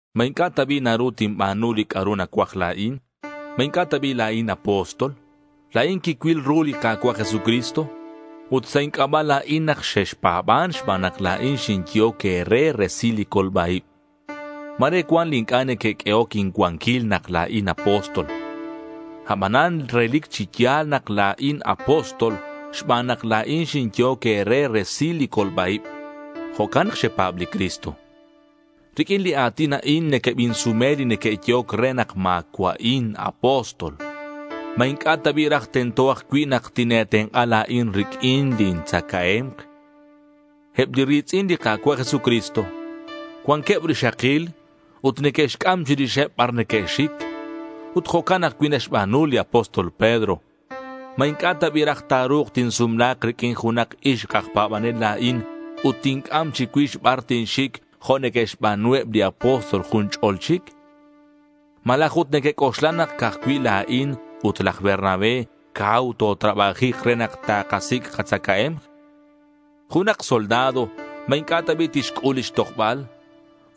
¿Ma inc'a' ta bi' naru tinba̱nu li c'a'ru nacuaj la̱in? ¿Ma inc'a' ta bi' la̱in apóstol? La̱in quicuil ru li Ka̱cua' Jesucristo. Ut sa' inc'aba' la̱in nak xexpa̱ban xban nak la̱in xinyehoc e̱re resil li colba-ib. Ma̱re cuan li inc'a' neque'q'uehoc incuanquil nak la̱in apóstol. Abanan relic chi ya̱l nak la̱in apóstol xban nak la̱in xinyehoc e̱re resil li colba-ib. Jo'can nak xepa̱b li Cristo. Riq'uin li a̱tin a'in nequebinsume li neque'yehoc re nak ma̱cua'in apóstol. ¿Ma inc'a' ta bi' raj tento ajcui' nak tine̱tenk'a la̱in riq'uin lin tzacae̱mk? Eb li ri̱tz'in li Ka̱cua' Jesucristo cuanqueb rixakil ut neque'xc'am chirixeb bar neque'xic. Ut jo'can ajcui' naxba̱nu li apóstol Pedro. ¿Ma inc'a' ta bi' raj ta̱ru̱k tinsumla̱k riq'uin junak ixk aj pa̱banel la̱in ut tinc'am chicuix bar tinxic jo' neque'xba̱nu eb li apóstol jun ch'o̱l chic? Malaj ut nequec'oxla nak ca'aj cui' la̱in ut laj Bernabé cau totrabajik re nak takasic' katzacae̱mk. Junak soldado, ¿ma inc'a' ta bi' tixc'ul lix tojbal?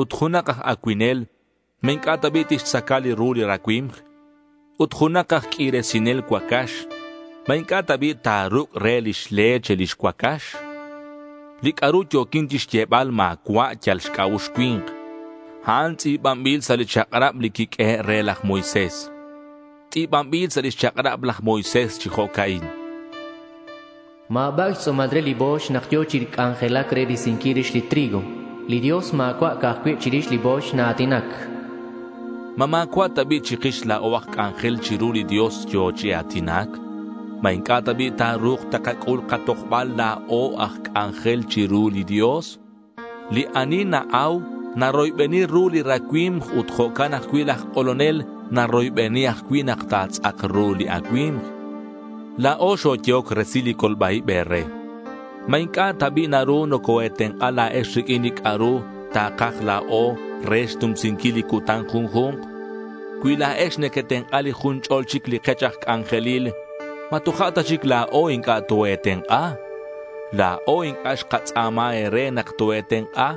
Ut junak aj acuinel, ¿ma inc'a' ta bi' tixtzaca li ru li racui̱mk? Ut junak aj q'uirisinel cuacax, ¿ma inc'a' ta bi' ta̱ruc' re lix leche lix cuacax? Li c'a'ru yo̱quin chixyebal ma̱cua' yal xc'a'ux cui̱nk. A'an tz'i̱banbil sa' li chak'rab li quiq'uehe' re laj Moisés. Tz'i̱banbil sa' lix chak'rab laj Moisés chi jo'ca'in: Ma̱bac' xtz'u̱mal re li bo̱yx nak yo̱ chi c'anjelac re risinquil rix li trigo. Li Dios ma̱cua' ca'aj cui' chirix li bo̱yx naa̱tinac. ¿Ma ma̱cua' ta bi' chikix la̱o aj c'anjel chiru li Dios yo̱ chi a̱tinac? ¿Ma inc'a' ta bi' ta̱ru̱k takac'ul katojbal la̱o aj c'anjel chiru li Dios? Li ani na-au naroybeni ru li racui̱mk ut jo'can ajcui' laj k'olonel naroybeni ajcui' nak ta̱tz'ak ru li acui̱mk. La̱o xoyehoc resil li colba-ib e̱re. ¿Ma inc'a' ta bi' naru nocoe̱tenk'a' la̱ex riq'uin li c'a'ru takaj la̱o re xnumsinquil li cutan junju̱nk? Cui la̱ex nequetenk'a li jun ch'ol chic li kech aj c'anjelil, ¿ma toja' ta chic la̱o inc'a' toe̱tenk'a? La̱o inc'a' xkatz'a̱ma e̱re nak toe̱tenk'a.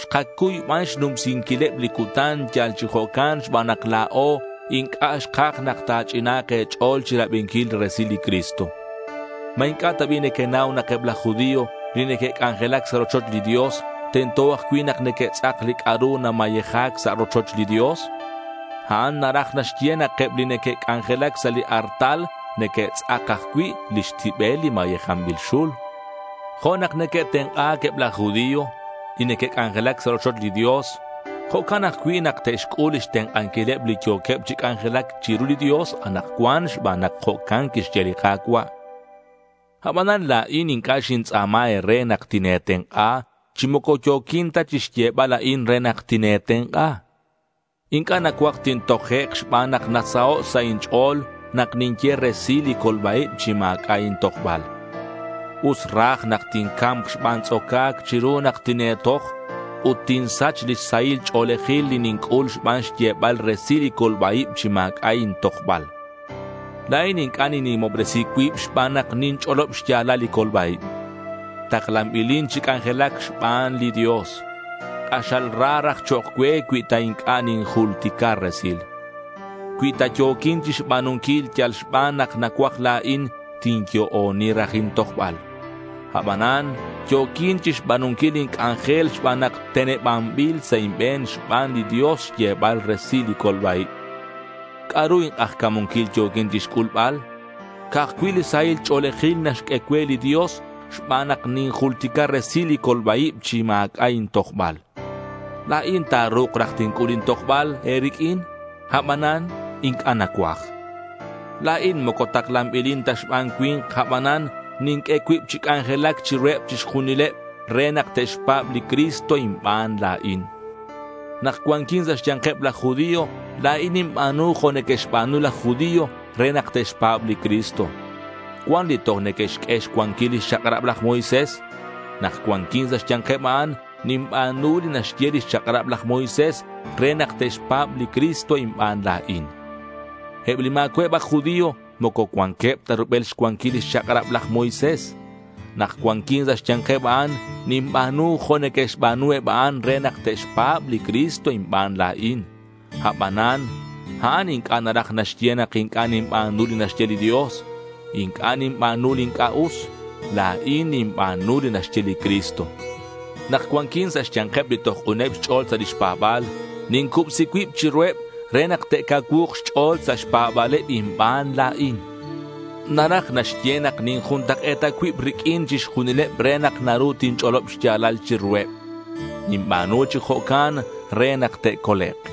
Xkacuy ban xnumsinquileb li cutan yal chi jo'can xban nak la̱o inc'a' xkaj nak ta̱ch'ina̱nk e̱ch'o̱l chirabinquil li resil li Cristo. ¿Ma inc'a' ta bi' nequenau nak eb laj judío li neque'c'anjelac sa' rochoch li Dios, tento ajcui' nak neque'tz'ak li c'a'ru namayeja̱c sa' rochoch li Dios? A'an naraj naxye nak eb li neque'c'anjelac sa' li artal neque'tz'ak ajcui' lix tibel li mayejanbil xul. Jo' nak neque'tenk'a̱c eb laj judío li neque'c'anjelac sa' rochoch li Dios, jo'can ajcui' nak te'xc'ul lix tenk'anquileb li yo̱queb chi c'anjelac chiru li Dios anakcuan xban nak jo'can quixye li Ka̱cua'. Abanan la̱in inc'a' xintz'a̱ma e̱re nak tine̱tenk'a, chi moco yo̱quin ta chixyebal a'in re nak tine̱tenk'a. Inc'a' nacuaj tintojek' xban nak nasaho' sa' inch'o̱l nak ninye resil li colba-ib chi ma̱c'a' intojbal. Us raj nak tinca̱mk xban tz'oca̱c chiru nak tine̱toj ut tinsach li sahil ch'o̱lejil li ninc'ul xban xyebal resil li colba-ib chi ma̱c'a' intojbal. La̱in inc'a' ninnimobresi cuib xban nak ninch'olob xya̱lal li colba-ib. Taklanbilin chi c'anjelac xban li Dios. K'axal ra raj chok' cue cui ta inc'a' ninjultica resil. Cui ta yo̱quin chixba̱nunquil yal xban nak nacuaj la̱in, tinyo'oni raj intojbal. Abanan yo̱quin chixba̱nunquil lin c'anjel xban nak tenebanbil sa' inbe̱n xban li Dios xyebal resil li colba-ib. ¿C'a'ru ink'ajca̱munquil yo̱quin chixc'ulbal? Ca'aj cui' li sahil ch'o̱lejil naxq'ue cue li Dios xban nak ninjultica resil li colba-ib chi ma̱c'a' intojbal. La̱in ta̱ru̱k raj tinc'ul intojbal e̱riq'uin abanan inc'a' nacuaj. La̱in moco taklanbilin ta xban cui̱nk, abanan ninq'ue cuib chi c'anjelac chiruheb chixjunileb re nak te'xpa̱b li Cristo inban la̱in. Nak cuanquin sa' xya̱nkeb laj judío la̱in ninba̱nu jo' neque'xba̱nu laj judío re nak te'xpa̱b li Cristo. Cuan li toj neque'xq'ue xcuanquil lix chak'rab laj Moisés. Nak cuanquin sa' xya̱nkeb a'an, ninba̱nu li naxye lix chak'rab laj Moisés re nak te'xpa̱b li Cristo inban la̱in. Eb li ma̱cua'eb aj judío moco cuanqueb ta rubel xcuanquil lix chak'rab laj Moisés. Nak cuanquin sa' xya̱nkeb a'an, ninba̱nu jo' neque'xba̱nu eb a'an re nak te'xpa̱b li Cristo inban la̱in. Abanan a'an inc'a' naraj naxye nak inc'a' ninba̱nu li naxye li Dios. Inc'a' ninba̱nu li inc'a' us. La̱in ninba̱nu li naxye li Cristo. Nak cuanquin sa' xya̱nkeb li toj k'uneb xch'o̱l sa' lix pa̱ba̱l, nincubsi cuib chiruheb re nak te'cacuu̱k xch'o̱l sa' xpa̱ba̱leb inban la̱in. Naraj naxye nak ninjuntak'e̱ta cuib riq'uin chixjunileb re nak naru tinch'olob xya̱lal chiruheb. Ninba̱nu chi jo'can re nak te'colek'.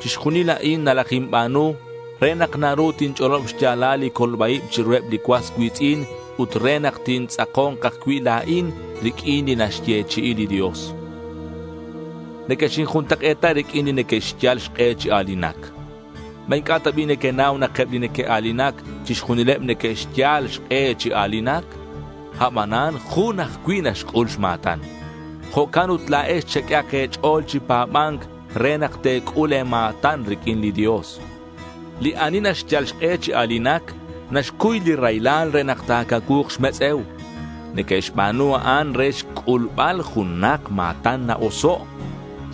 Chixjunil a'in nalajinba̱nu re nak naru tinch'olob xya̱lal li colba-ib chiruheb li cuas cui̱tz'in ut re nak tintz'ako̱nk ajcui' la̱in riq'uin li naxyechi'i li Dios. Nequexinjuntak'e̱ta riq'uineb li neque'xyal xk'e chi a̱linac. ¿Ma inc'a' ta bi' nequenau nak eb li neque'a̱linac chixjunileb neque'xyal xk'e chi a̱linac? Abanan jun ajcui' naxc'ul xma̱tan. Jo'can ut la̱ex cheq'uehak e̱ch'o̱l chi pa̱ba̱nc re nak te̱c'ul e̱ma̱tan riq'uin li Dios. Li ani naxyal xk'e chi a̱linac naxcuy li raylal re nak ta̱cacuu̱k xmetz'e̱u. Neque'xba̱nu a'an re xc'ulbal junak ma̱tan na-oso'.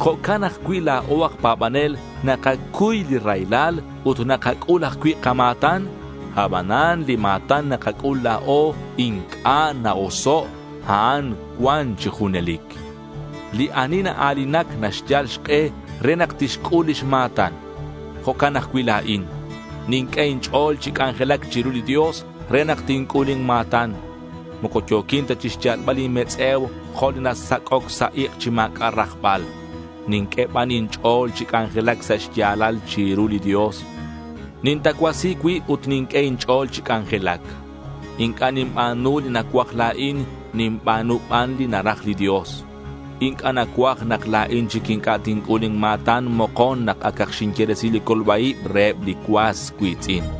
Jo'can ajcui' la̱o aj pa̱banel nakacuy li raylal ut nakac'ul ajcui' kama̱tan. Abanan li ma̱tan nakac'ul la̱o inc'a' na-oso'. A'an cuan chi junelic. Li ani naa̱linac naxyal xk'e re nak tixc'ul lix ma̱tan. Jo'can ajcui' la̱in. Ninq'ue inch'o̱l chi c'anjelac chiru li Dios re nak tinc'ul inma̱tan. Moco yo̱quin ta chixyalbal inmetz'e̱u jo' li nasac'oc sa' ik' chi ma̱c'a' rajbal. Ninq'ue ban inch'o̱l chi c'anjelac sa' xya̱lal chiru li Dios. Nintacuasi cuib ut ninq'ue inch'o̱l chi c'anjelac. Inc'a' ninba̱nu li nacuaj la̱in. Ninba̱nu ban li naraj li Dios. Inc'a' nacuaj nak la̱in chic inc'a' tinc'ul lin ma̱tan mokon nak acak xinye resil li colba-ib reheb li cuas cui̱tz'in.